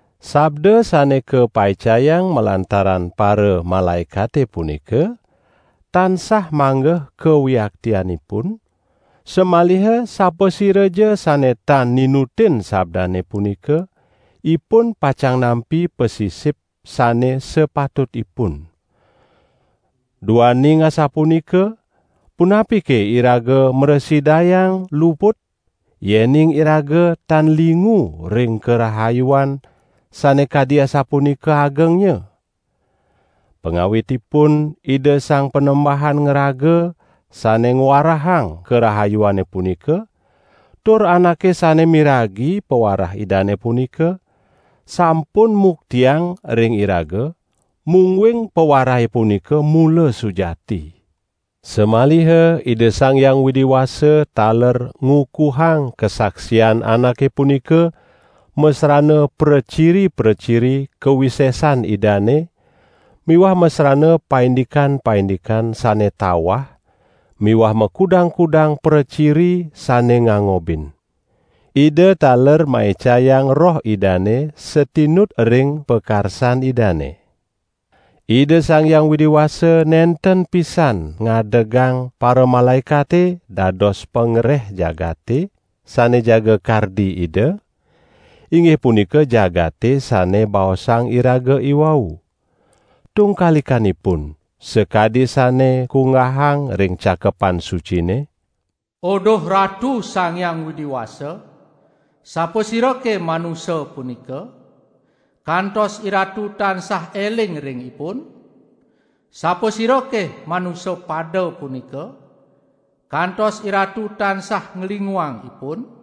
Sabda sane kapaicayang malantaran paramalaekate punika, tansah manggeh kawiaktianipun, samaliha sapasiraja sane tan ninutin sabdane punika, ipun pacang nampi pasisip sane sapatutipun. Duaning asapunika, punapike iraga mrasidayang luput, yening iraga tan lingu ring karahayuan sane kadi asapunika agengnya? Pangawitipun Ida Sang Panembahan ngraga sane ngwarahang karahayuane punika, tur anake sane miragi pawarah Idane punika, sampun muktiang ring iraga, mungguing pawarahe punika mula sujati. Samaliha Ida Sang Hyang Widi Wasa taler ngukuhang kasaksian anake punika masrana praciri-praciri kawisesan Idane miwah masrana paindikan-paindikan sane tawah miwah makudang-kudang praciri sane ngangobin. Ida taler maicayang Roh Idane satinut ring pakarsan Idane. Ida Sang Hyang Widi Wasa nenten pisan ngadegang paramalaekate dados pangreh jagate sane jaga kardi Ida, inggih punika jagate sane baosang iraga iwau. Tungkalikanipun, sakadi sane kunggahang ring Cakepan Sucine: "Uduh Ratu Sang Hyang Widi Wasa, sapasirake manusa punika, kantos IRatu tansah eling ring ipun? Sapasirake manusa pada punika, kantos IRatu tansah nglinguang ipun?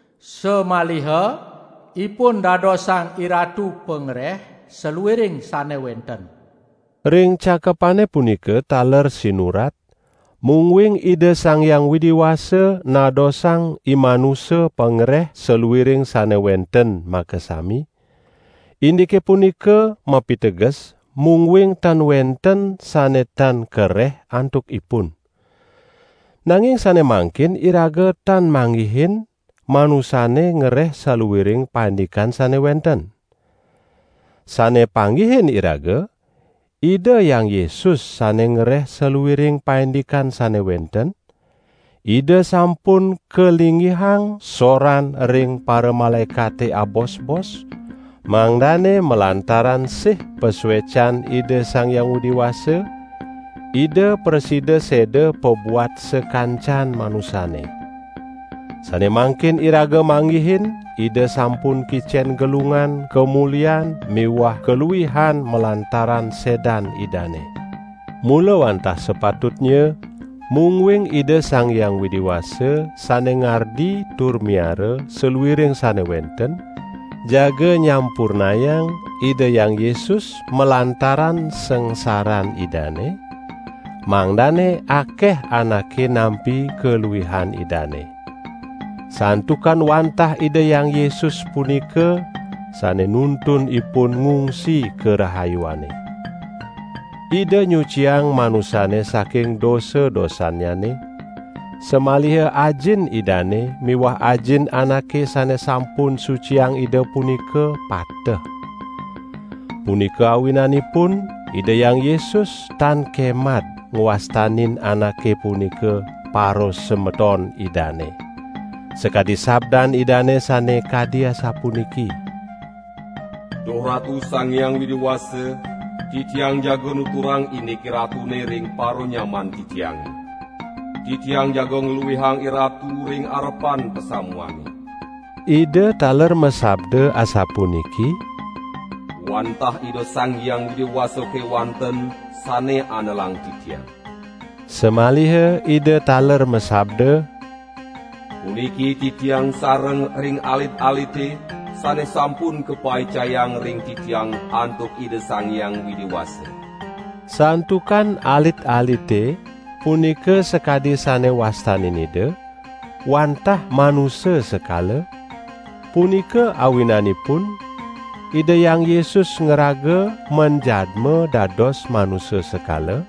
samaliha ipun dadosang IRatu pangreh saluiring sane wenten." Ring cakepane punika taler sinurat, mungguing Ida Sang Hyang Widi Wasa nadosang imanusa pangreh saluiring sane wenten makasami, indike punika mapiteges mungguing tan wenten sane tan kareh antuk ipun. Nanging sane mangkin iraga tan manggihin manusane ngereh saluiring paindikan sane wenten. Sane panggihin iraga Ida Hyang Yesus, sane ngereh saluiring paindikan sane wenten, Ida sampun kalinggihang soran ring paramalaekate abosbos, mangdane malantaran sih pasuecan Ida Sang Hyang Widi Wasa, Ida prasida seda pabuat sakancan manusane. Sane mangkin iraga manggihin Ida sampun kicen gelungan kamulian miwah kaluihan malantaran sedan Idane. Mula wantah sapatutnya, mungguing Ida Sang Hyang Widi Wasa, sane ngardi tur miara saluiring sane wenten, jaga nyampurnayang Ida Hyang Yesus malantaran sangsaran Idane, mangdane akeh anake nampi kaluihan Idane. Santukan wantah Ida Hyang Yesus punika, sane nuntun ipun ngungsi karahayuane. Ida nyuciang manusane saking dosa-dosannyane, samaliha Ajin Idane miwah Ajin anake sane sampun suciang Ida punika pateh. Punika awinanipun Ida Hyang Yesus tan kemad ngwastanin anake punika parasemeton Idane. Sakadi sabdan Idane sane kadi asapuniki: "Duh Ratu Sang Hyang Widi Wasa, Titiang jaga nuturang indik IRatune ring paranyaman Titiange. Titiang jaga ngluihang IRatu ring arepan pasamuane." Ida taler masabda asapuniki: "Wantah Ida Sang Hyang Widi Wasa kewanten sane andelang Titiang." Samaliha Ida taler masabda: "Puniki Titiang sareng ring alit-alite, sane sampun kapaicayang ring Titiang antuk Ida Sang Hyang Widi Wasa." Santukan alit-alite, punika sakadi sane wastanin Ida, wantah manusa sekala, punika awinanipun Ida Hyang Yesus ngraga manjadma dados manusa sekala,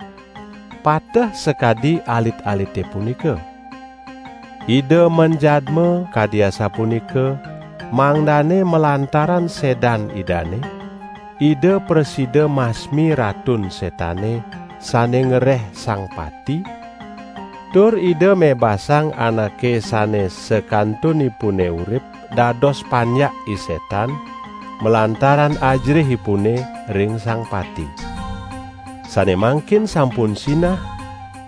pateh sakadi alit-alite punika. Ida manjadma kadi asapunika, mangdane malantaran sedan Idane, Ida prasida masmi Ratun Setane, sane ngereh sang pati, tur Ida mebasang anake sane sakantunipune urip dados panjak I Setan malantaran ajerihipune ring sang pati. Sane mangkin sampun sinah,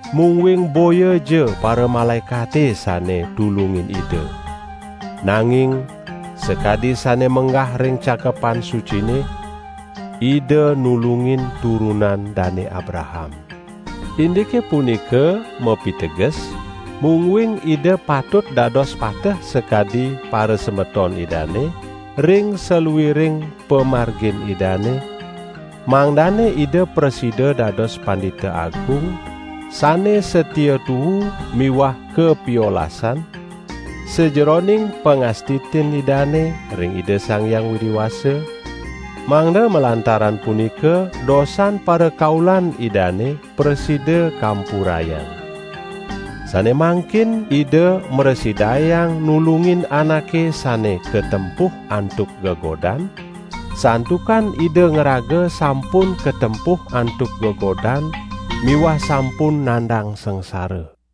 mungguing boyaja paramalaekate sane tulungin Ida. Nanging, sakadi sane menggah ring Cakepan Sucine: "Ida nulungin turunan Dane Abraham." Indike punika mapiteges, mungguing Ida patut dados pateh sakadi parasemeton Idane ring saluiring pamargin Idane, mangdane Ida prasida dados Pandita Agung sane satia tuu miwah kapiolasan, sajeroning pangastitin Idane ring Ida Sang Hyang Widi Wasa, mangda malantaran punika dosan parakaulan Idane prasida kampurayang. Sane mangkin Ida mrasidayang nulungin anake sane katempuh antuk gegodan, santukan Ida ngraga sampun katempuh antuk gegodan miwah sampun nandang sangsara.